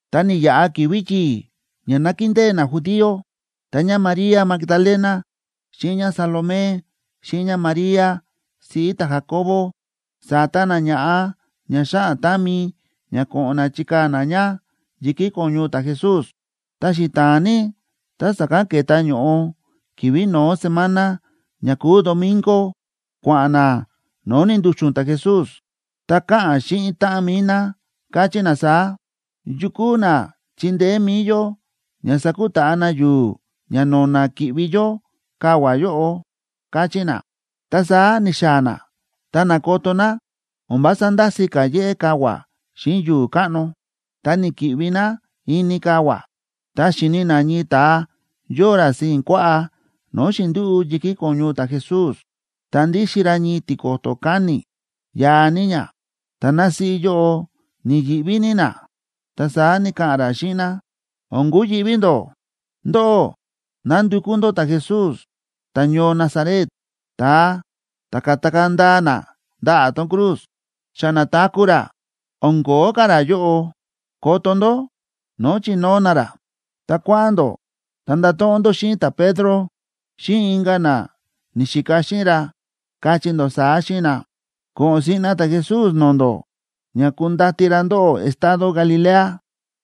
Ta ni̱yaꞌa ki̱vi̱ yi̱i̱ ña nákindée najudío, ta ñáMaría Magdalena xíꞌin ñáSalomé, xíꞌin ñáMaría siꞌí ta̱Jacobo, sa̱ta ná ña̱ꞌa ña xáꞌan támi ña ko̱ꞌo̱n ná chikaa̱ ná ña yi̱kí ko̱ñu ta̱Jesús. Ta xita̱a̱n ní ta sa̱kán ke̱ta ño̱ꞌo, ki̱vi̱ no̱ó semana ña kúu domingo, kua̱ꞌa̱n ná no̱o̱ ni̱ndu̱xu̱n ta̱Jesús. Ta káꞌa̱n xíꞌin táꞌan mi̱i ná, káchí ná saá: ―¿Yu kúu na chindeé mi̱i yó ña sakutaꞌa na yu̱u̱ ña no̱na̱ ki̱ꞌvi yó kavua̱ yóꞌo? ―káchí ná. Ta saá ni̱xaa̱ ná, ta na̱koto ná o̱n vása ndási̱ ka̱ yéꞌé kavua̱ xíꞌin yu̱u̱ káꞌno. Ta ni̱ki̱ꞌvi ná ini kavua̱. Ta xi̱ni ná ñii ta̱a yóo ra sii̱n kuaꞌá no̱o̱ xi̱ndúꞌu̱ yi̱kí ko̱ñu ta̱Jesús, ta ndíxin ra ñii tiko̱to̱ káni̱, yaa ní ña, ta násíꞌí yóꞌo ni̱yi̱ꞌví ní ná. Ta saá ni̱ka̱ꞌa̱n ra xíꞌin ná: ―O̱n kuyi̱ꞌví ndó. Ndóꞌó nándukú ndó ta̱Jesús ta̱ñoo Nazaret, ta̱a ta̱ ka̱takaa̱ ndaa na ndaꞌa̱ tón cruz. Xa na̱taku̱ ra. O̱n ko̱ó ka̱ ra yóꞌo. Koto ndó no̱o̱ chi̱nóo na ra. Ta kua̱ꞌa̱n ndó ta ndato̱ꞌon ndó xíꞌin ta̱Pedro xíꞌin inka̱ na ni̱xika xíꞌin ra, kachí ndó saá xíꞌin na: “Ko̱ꞌo̱n siꞌna ta̱Jesús no̱o̱ ndó ña kundati ra ndóꞌó estado Galilea.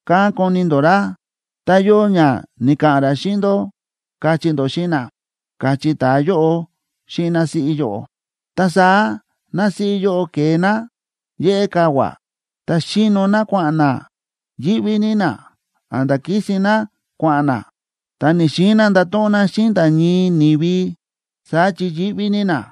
Kán koni ndó ra, tá yóo ña ni̱ka̱ꞌa̱n ra xíꞌin ndó”, kachí ndó xíꞌin na ―káchí ta̱a yóꞌo xíꞌin násíꞌí yóꞌo. Ta saá násíꞌí yóꞌo ke̱e ná yéꞌé kavua̱, ta xíno ná kua̱ꞌa̱n ná, yíꞌví ní ná a̱nda̱ kísin ná kua̱ꞌa̱n ná. Ta ni̱‑xiin ná ndato̱ꞌon ná xíꞌin nda̱ ñii ni̱vi, saá chi yíꞌví ní ná.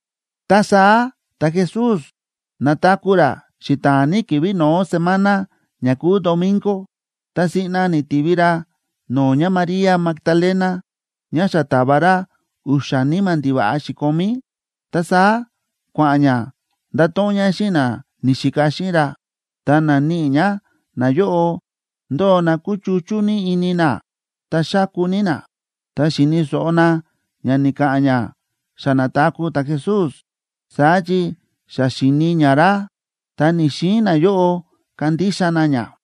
Ta saá ta̱Jesús na̱taku̱ ra xita̱a̱n ní ki̱vi̱ no̱ó semana ña kúu domingo. Ta siꞌna ni̱tivi ra no̱o̱ ñáMaría Magdalena ñá xa ta̱va ra u̱xa̱ níma̱ ndiva̱ꞌa xi̱komí. Ta saá kua̱ꞌa̱n ñá ndato̱ꞌon ñá xíꞌin na ni̱xika xíꞌin ra. Ta na̱níꞌi ñá nayóꞌo, ndóo na kúchuchú ní ini na ta xáku ní na. Ta xi̱ni̱ so̱ꞌo na ña ni̱ka̱ꞌa̱n ñá xa na̱taku̱ ta̱Jesús, saá chi xa xi̱ni ñá ra, ta ni̱‑xiin nayóꞌo kandixa na ñá.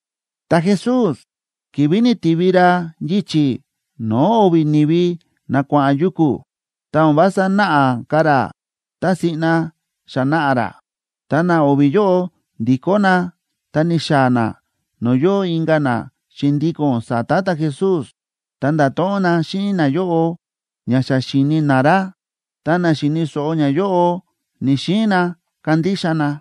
Ta̱Jesús, ki̱vi̱ ni̱tivi ra yichi̱ no̱o̱ o̱vi̱ ni̱vi na kua̱ꞌa̱n yuku̱, ta o̱n vása náꞌa ka̱ ra tá siꞌna xa na̱ꞌa ra. Ta na o̱vi̱ yóꞌo ndi̱kó na ta ni̱xaa̱ na no̱o̱ yóo inka̱ na xi̱ndíko̱n sa̱ta̱ ta̱Jesús, ta nda̱to̱ꞌon na xíꞌin nayóꞌo ña xa xi̱ni na ra, ta na xi̱ni̱ so̱ꞌo ñayóꞌo ni̱‑xiin na kandixa na.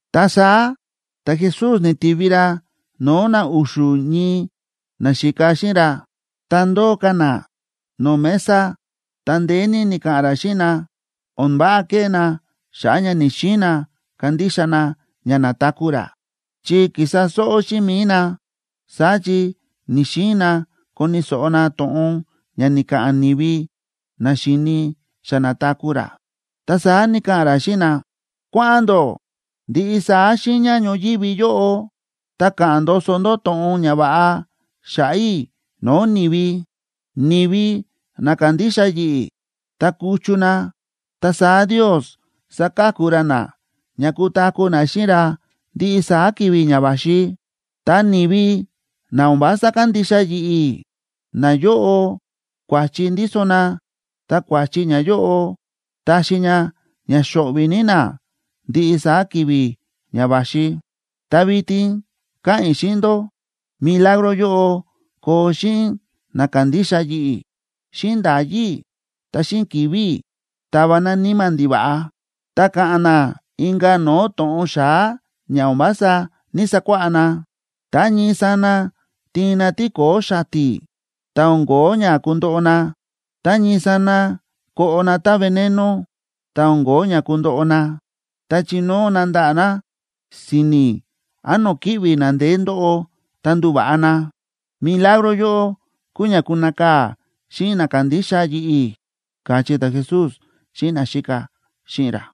Ta saá ta̱Jesús ni̱tivi ra no̱o̱ na u̱xu̱ ñii naxíka xíꞌin ra, tá ndóo ka̱ na no̱o̱ mesa. Ta ndeé ní ni̱ka̱ꞌa̱n ra xíꞌin na o̱n váꞌa kéꞌé na xa̱ꞌa̱ ña ni̱‑xiin na kandixa na ña na̱taku̱ ra, chi kísa sóꞌó xíꞌin mi̱i na, saá chi ni̱‑xiin na koni̱ so̱ꞌo na to̱ꞌon ña ni̱ka̱ꞌa̱n ni̱vi na xi̱ni xa na̱taku̱ ra. Ta saá ni̱ka̱ꞌa̱n ra xíꞌin na: ―Kua̱ꞌa̱n ndó ndiꞌi saá xiiña ñoyívi yóꞌo ta ka̱ꞌa̱n ndoso ndó to̱ꞌon ñava̱ꞌa xa̱ꞌa̱ i̱ no̱o̱ ni̱vi. Ni̱vi na kandixa yi̱ꞌi̱ ta kuchu na, ta saá Ndios saka̱ku ra na ña kutaku̱ na xíꞌin ra ndiꞌi saá ki̱vi̱ ña va̱xi. Ta ni̱vi na o̱n vása kandixa yi̱ꞌi̱, nayóꞌo kua̱chi ndíso na ta kua̱chi ñayóꞌo taxi ña ña xo̱ꞌvi̱ ní na ndiꞌi saá ki̱vi̱ ña va̱xi. Ta vitin káꞌa̱n i̱ xíꞌin ndó, milagro yóꞌo koo xíꞌin na kándixa yi̱ꞌi̱: xíꞌin nda̱yí i̱ ta xíꞌin ki̱vi̱ i̱ tava na níma̱ ndiva̱ꞌa; ta ka̱ꞌa̱n na inka̱ no̱o̱ to̱ꞌon xa̱á ña o̱n vása ní‑sakuáꞌá na; tá ñii sana tiin na tíko̱o̱ xati̱ ta o̱n kóo ña kundoꞌo na; tá ñii sana koꞌo na tá veneno ta o̱n kóo ña kundoꞌo na; ta chinóo na ndaꞌa̱ na si̱ni̱ án no̱o̱ kíꞌvi̱ na ndeé ndóꞌo ta nduva̱ꞌa na. Milagro yóꞌo kuu ña kunakaa̱ xíꞌin na kándixa yi̱ꞌi̱ ―káchí ta̱Jesús xíꞌin naxíka xíꞌin ra.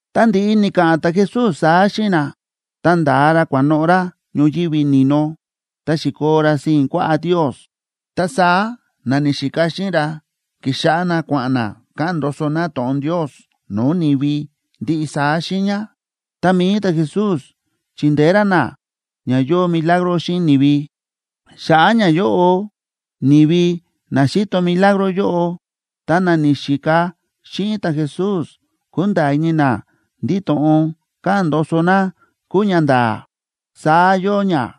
Tá ndi̱ꞌi ni̱ka̱ꞌa̱n ta̱Jesús saá xíꞌin na, ta nda̱a ra kua̱noꞌo̱ ra ñoyívi ni̱no, ta xi̱koo ra sii̱n kuaꞌá Ndios. Ta saá na ni̱xika xíꞌin ra ki̱xáꞌá na kua̱ꞌa̱n na ka̱ꞌa̱n ndoso na to̱ꞌon Ndios no̱o̱ ni̱vi ndiꞌi saá xiiña. Ta mi̱i ta̱Jesús chíndeé ra na ña yóo milagro xíꞌin ni̱vi. Xa̱ꞌa̱ ñayóꞌo ni̱vi na xi̱to milagro yóꞌo ta na ni̱xika xíꞌin ta̱Jesús kúnda̱a̱ ini na ndí to̱ꞌon káꞌa̱n ndoso na kúu ñanda̱a̱. Saá yóo ña.